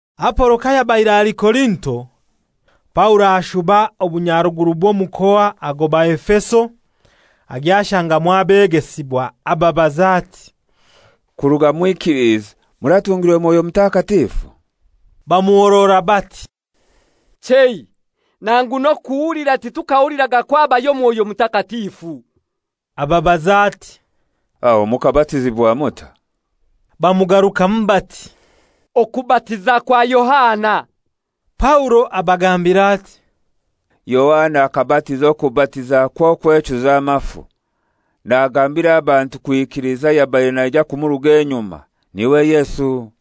Apolo kayabaire ali Korinto, Paulo ashuba obunyaruguru bw'omukoa agoba Efeso; agya ashangamu abegesibwa. Ababaza ati, «Kuruga mwikilize muratungirwe Mwoyo Mutakatifu?» Bamuhorora bati, «Chei, nangu n'okuhulira titukahuliraga kwo habayo Mwoyo Mutakatifu.» Ababaza ati, «Aho mukabatizibwa mutai?» Bamugarukamu bati, «Okubatiza kwa Yohana.» Paulo abagambira ati, «Yohana akabatiza okubatiza kw'okwechuza amafu, nagambira abantu kwikiliza ayabaire naija kumuruga enyuma, n'iwe Yesu.»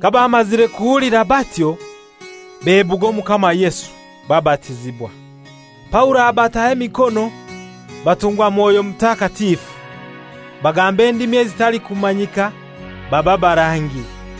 Kabamazire kuhulira batyo, bebuga Omukama Yesu, babatizibwa. Paulo abataho emikono, batungwa Mwoyo Mutakatifu. Bagamba endimi ezitalikumanyika, baba barangi.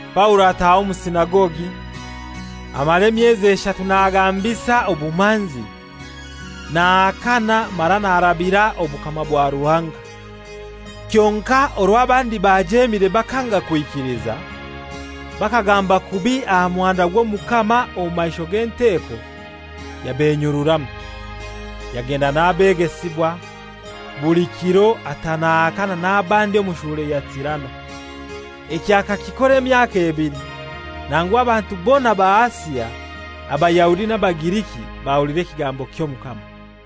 Paulo ataaha omu sinagogi, amara emyezi eshatu nagambisa obumanzi, nahakana mara narabira obukama bwa Ruhanga. Kyonkai orwo abandi bajemire bakanga kwikiliza, bakagamba kubi aha muhanda gw'Omukama omu maisho g'enteko, yabenyururamu. Yagenda n'abegesibwa, buli kiro ata nahakana n'abandi omu shule ya Tirano. Ekyo akakikora emyaka ebili, nangu abantu bona ba Asia, Abayahudi n'Abagiriki, bahulira ekigambo ky'Omukama.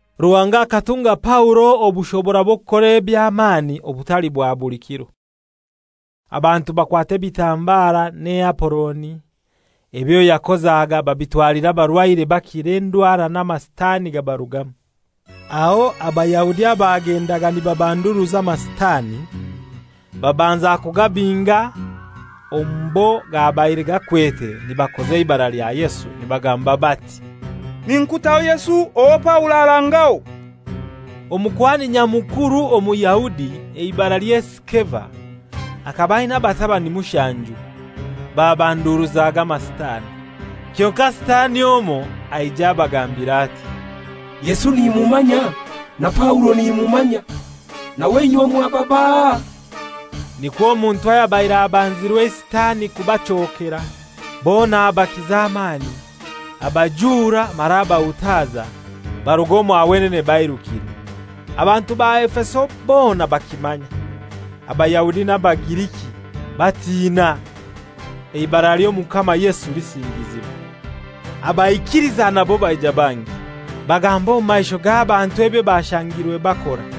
Ruhanga akatunga Paulo obushobora bw'okukora eby'amani obutali bwa buli kiro. Abantu bakwata ebitambara n'eaporoni ebyo yakozaga babitwalira abarwaire bakira endwara n'amasitani gabarugamu. Aho Abayahudi abagendaga nibabanduruza amasitani babanza kugabinga omu bo gabaire gakwete nibakoza eibara lya Yesu, nibagamba bati, «Ninkutaho Yesu owo Paulo arangaho.» Omukuhani Nyamukuru Omuyahudi, eibaralye Sikeva, akaba aina abatabani mushanju; babanduruzaga amasitani. Kyonkai Sitani omoi aija abagambira ati, «Yesu nimumanya, na Paulo nimumanya; nawe inywe mwaba baahai?» Nikwo omuntu ayabaire abanzirwe eisitani kubachokera, bona abakiza amani, abajura mara abahutaza, barug'omwa wenene bairukire. Abantu ba Efeso bona bakimanya, Abayahudi n'Abagiriki. Batina; eibara ly'Omukama Yesu lisingizibwa. Abaikiliza nabo baija bangi, bagamba omu maisho g'abantu ebyo bashangirwe bakora.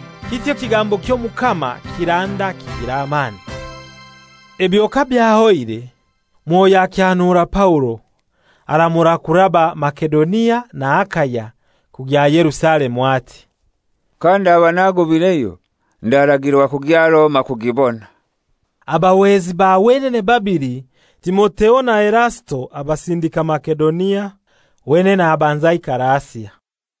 Kityo ekigambo ky'Omukama kiranda kigira amani. Ebyo kabyahoire, Mwoyo akyanura Paulo, aramura kuraba Masedonia na Akaya kugya Yerusalemu, ati, «Kandaba nagobaireyo ndaragirwa kugya Roma kugibona.» Abahwezi ba wenene babili Timotheo na Erasito abasindika Masedonia, wenene abanza aikara Asia.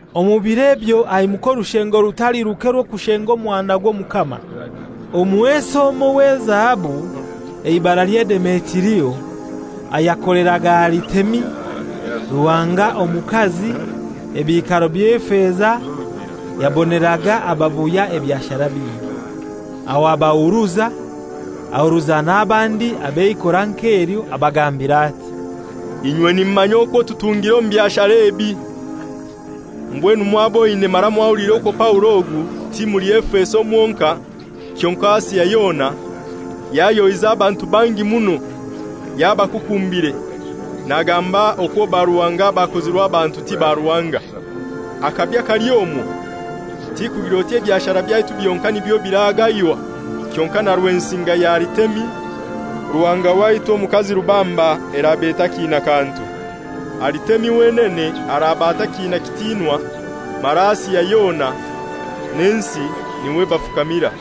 Omu bir'ebyo haimuka orushengo rutali ruke rw'okushenga omuhanda gw'Omukama. Omuhesi omoi w'ezahabu eibaralye Demetirio, ayakoleraga Aritemi, ruhanga omukazi, ebiikaro by'efeza, yaboneraga ababuya ebyashara bingi. Aho abahuruza, ahuruza n'abandi ab'eikora nk'elyo abagambira ati, «Inywe nimumanya okwo tutungira omu byashara ebi. Mbwenu mwaboine mara mwahuliire okwo Paulo ogu ti muli Efeso mwonkai kyonkai Asia yona, yayohize abantu bangi muno yabakukumbire, nagamba okwo baruhanga abakozirwe abantu ti baruhanga. Akabi kali omwo ti kugira oti ebyashara byaitu byonkai nibyo biragaywa, kyonkai na rwensinga ya Aritemi, ruhanga waitu omukazi rubamba eraba etakiina kantu. Aritemi wenene araba atakiina kitinwa, mara Asia yona n'ensi n'iwe bafukamira.»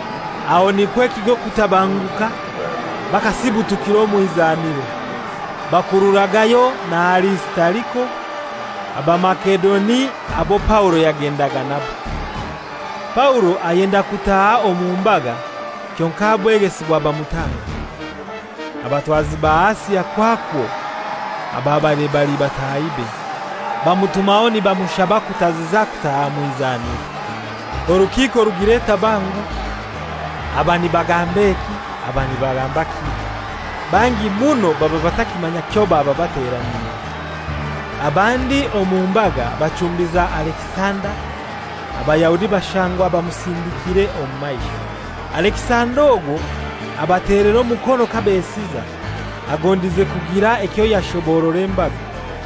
Aho nikwo ekigo kutabanguka, bakasibutukira omu izaniro, bakurura Gayo na Arisitariko, Abamasedoni abo Paulo yagendaga nabo. Paulo ayenda kutaaha omu mbaga kyonkai abegesibwa bamutanga. Abatwazi ba Asia kwakwo, ababaire bali batahibe, bamutumaho nibamushaba kutaziza kutaaha mw'izaniro. Orukiiko rugira etabangu, aba nibagamba eki, aba nibagamba kili; bangi muno baba batakimanya kyo baba bateraniire. Abandi omu mbaga bachumbiza Alekisanda, Abayahudi bashangwa bamusindikire omu maisho. Alekisanda ogwo abatelera omukono kabesiza, agondize kugira ekyo yashoborora embaga.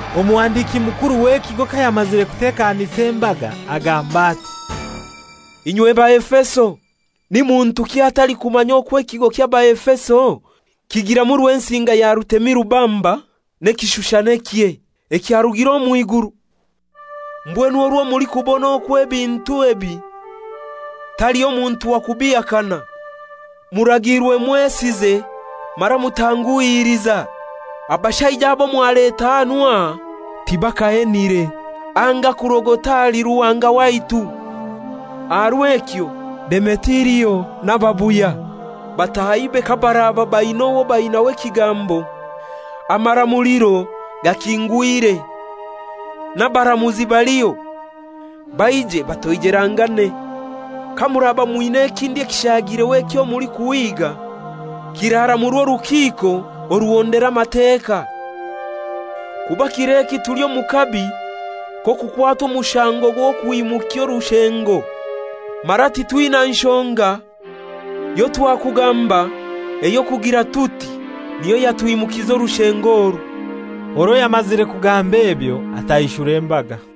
Omuhandiki mukuru w'ekigo kayamazire kutekanisa embaga, agamba ati, «Inywe Baefeso, ni muntuki atalikumanya okwo ekigo ky'Abaefeso kigiramu rwensinga ya Aritemi rubamba n'ekishushanikye ekyarugire omw'iguru? Mbwenu orwo mulikubona okwo ebintu ebi taliho muntu wa kubihakana, muragiirwe mwesize mara mutanguhiliza. Abashaija abo mwaleta hanu aha tibakahenire anga kurogota ahali ruhanga waitu. Aha rw'ekyo Demetirio n'ababuya batahibe kabaraba baina owo bainaho ekigambo, amaramuliro gakingwire, n'abaramuzi baliho, baije batoijelangane. Kamuraba mwina ekindi ekishagireho ekyo mulikuhiiga, kiraramurwa orukiiko oruhondera Amateka. Kuba kir'eki tuli omu kabi k'okukwatwa omushango gw'okwimukya orushengo; mara titwina nshonga yotwakugamba ey'okugira tuti niyo yatwimukisa orushengo oru.» Orwo yamazire kugamba ebyo, ataishura embaga.